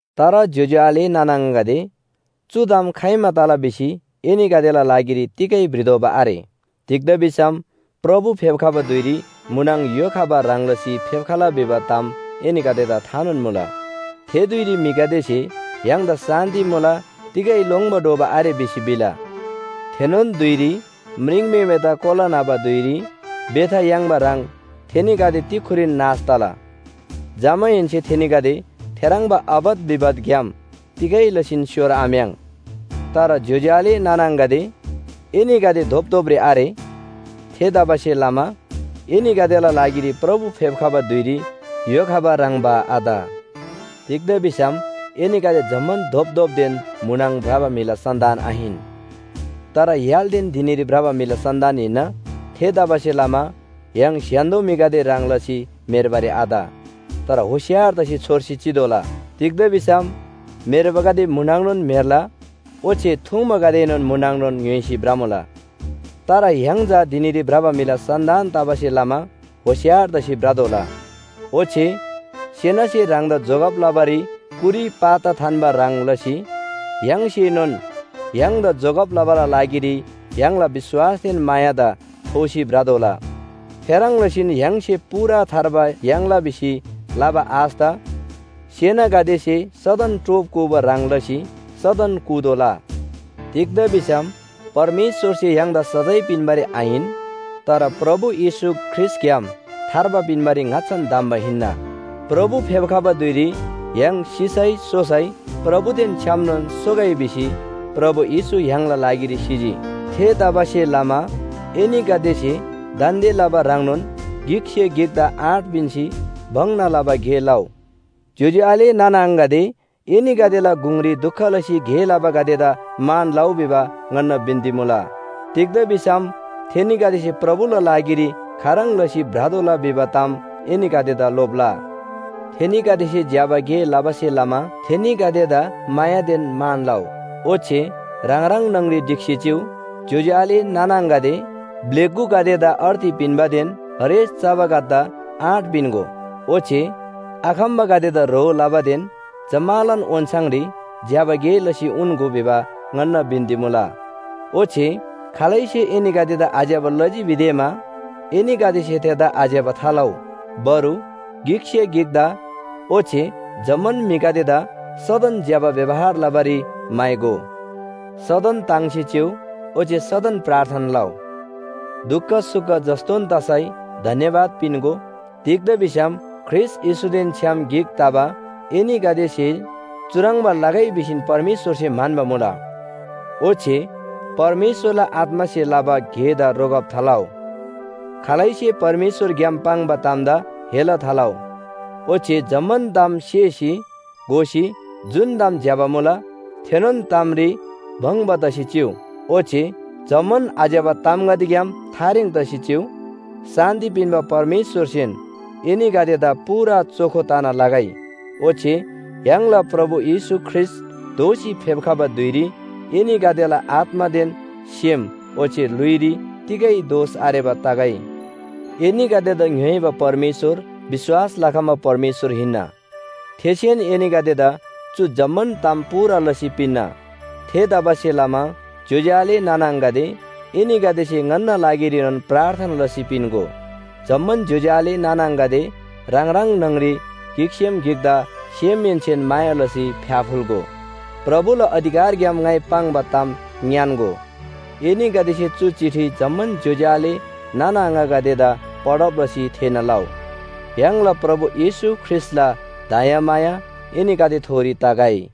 तर ज्‍योज्‍यो आले नाना आङागदे, चु ताम खाइमा तला भिसी एनीगदेला लागिरी तिगै भ्रितोःबा आरे। तिग्‍दा भिसम प्रभु फेप्‍खबा धुइरी म्‍हुनङ य्‍हो खबा ह्रङ् लसी फेप्‍खला भिबा ताम एनीगदेदा थानोन मुला। थे धुइरी म्‍हिगदेसे “य्‍हाङदा शान्‍ति मुला तिगै लोङ्‌बा डोबा आरे भिसी भिला।” थेनोन धुइरी म्रिङम्‍हेमेदा कोला न्‍हबा धुइरी बेथा याङ्बा ह्रङ् थेनीगदे तिक्‍खुरीन नाश तला। जमाहेन्‍से थेनीगदे थेह्रङ्बा आपत विपतग्‍याम तिगै लसीन स्‍योर आम्‍याङ्। तर ज्‍योज्‍यो आले नाना आङागदे, एनीगदे धोपधोपरी आरे। थेतबासेलमा एनीगदेला लागिरी प्रभु फेप्‍खबा धुइरी य्‍हो खबा ह्रङ्‌बा आत। तिग्‍दा भिसम एनीगदे जम्‍मान धोपधोपदेन म्‍हुनङ भ्रबा म्‍हिला सन्‍तान आहिन, तर य्‍हालदेन धिनीरी भ्रबा म्‍हिला सन्‍तान हिन्‍ना। थेतबासेलमा य्‍हाङ स्‍य्‍हान्‍दो म्‍हिगदे ह्रङ् लसी म्‍हेर्बारी आत। तर होशियार तसी छोर्सी चितोःला। तिग्‍दा भिसम म्‍हेर्बागदे म्‍हुनङनोन म्‍हेर्ला ओच्‍छे थुङ्बागदेएनोन म्‍हुनङनोन ङ्‌य्‍होइसी भ्रमुला। तर य्‍हाङ चा धिनीरी भ्रबा म्‍हिला सन्‍तान तबासे लमा होशियार तसी भ्रतोःला। ओच्‍छे सेनासे ह्राङदा जोगब लबारी कुरी पाता थान्‍बा ह्रङ् लसी य्‍हाङसेनोन ह्राङदा जोगब लबाला लागिरी य्‍हाङला विश्‍वासदेन मायादा थोसी भ्रतोःला। थेह्रङ् लसीन य्‍हाङसे पूरा थार्बा याङ्ला भिसी लबा आशदा सेनागदेसे सदन टोप कूबा ह्रङ् लसी सदन कूतोःला। तिग्‍दा भिसम परमेश्‍वरसे य्‍हाङदा सजाय पिन्‍बारी आहिन। तर प्रभु येशू ख्रीष्‍टग्‍याम थार्बा पिन्‍बारी ङाच्‍छान धम्‍बा हिन्‍ना। प्रभु फेप्‍खबा धुइरी य्‍हाङ सिसै सोसै प्रभुदेन छ्‌यामनोन सोगै भिसी प्रभु येशू य्‍हाङला लागिरी सिजी। थेतबासेलमा एनीगदेसे दान्‍दे लबा ह्रङ्नोन गिकसे गिकदा आँट पिन्‍सी भङ्‍ना लबा गे लउ। ज्‍योज्‍यो आले नाना आङागदे, एनीगदेला गुङरी दुख लसी गे लबागदेदा मान लउ भिबा ङन्‍ना बिन्‍ती मुला। तिग्‍दा भिसम थेनीगदेसे प्रभुला लागिरी खाह्रङ् लसी भ्रतोःला भिबा ताम एनीगदेदा लोप्‍ला। थेनीगदेसे ज्‍यबा गे लबासे लमा थेनीगदेदा मायादेन मान लउ। ओच्‍छे ह्राङ ह्राङ न्‍हङरी ढिक्‍सी चिउ। ज्‍योज्‍यो आले नाना आङागदे, ब्‍लेगुगदेदा अर्ती पिन्‍बादेन हरेस चबागदेदा आँट पिन्‍गो। ओच्‍छे आखम्‍बागदेदा ह्रो लबादेन जम्‍मालान ओन्‍छाङरी ज्‍यबा गे लसी उन्‍गो भिबा ङन्‍ना बिन्‍ती मुला। ओच्‍छे खालैसे एनीगदेदा आज्‍यबा लजी भिदेमा एनीगदेसे थेदा आज्‍यबा थालउ। बरु गिकसे गिकदा ओच्‍छे जम्‍मान म्‍हिगदेदा सदन ज्‍यबा व्‍यवहार लबारी म्‍हाइगो। सदन ताङ्सी चिउ। ओच्‍छे सदन प्रार्थना लउ। दुख सुख जस्‍तोन तसै धन्‍यवाद पिन्‍गो। तिग्‍दा भिसम ख्रीष्‍ट येशूदेन छ्‌याम गिक तबा एनीगदेसे चुह्रङ्बा लगै भिसी परमेश्‍वरसे म्‍हन्‍बा मुला। ओच्‍छे परमेश्‍वरला आत्‍मासे लबा गेदा रोकब थालउ। खालैसे परमेश्‍वरग्‍याम पाङ्बा तामदा हेला थालउ। ओच्‍छे जम्‍मान ताम सेसी घोसी जुन ताम ज्‍यबा मुला थेनोन तामरी भङ्‍बा तसी चिउ। ओच्‍छे जम्‍मान आज्‍यबा तामगदेग्‍याम थारेङ तसी चिउ। शान्‍ति पिन्‍बा परमेश्‍वरसेन एनीगदेदा पूरा चोखो तना लगै, ओच्‍छे य्‍हाङला प्रभु येशू ख्रीष्‍ट दोःसी फेप्‍खबा धुइरी एनीगदेला आत्‍मादेन सेम ओच्‍छे ल्‍हुइरी तिगै दोष आरेबा तगै। एनीगदेदा ङ्‌योइबा परमेश्‍वर विश्‍वास लखम्‍बा परमेश्‍वर हिन्‍ना। थेसेन एनीगदेदा चु जम्‍मान ताम पूरा लसी पिन्‍ना। थेतबासेलमा ज्‍योज्‍यो आले नाना आङागदे, एनीगदेसे ङन्‍ना लागिरीनोन प्रार्थना लसी पिन्‍गो। जम्‍मान ज्‍योज्‍यो आले नाना आङागदे ह्राङ ह्राङ न्‍हङरी गिकसेम गिकदा सेमहेन्‍सेन माया लसी फ्‍याफुल्‍गो। प्रभुला अधिकारग्‍याम ङाइ पाङ्बा ताम ङ्‌यान्‍गो। एनीगदेसे चु चिठी जम्‍मान ज्‍योज्‍यो आले नाना आङागदेदा पढब लसी थेःना लउ। य्‍हाङला प्रभु येशू ख्रीष्‍टला दयामाया एनीगदेथोरी तगै।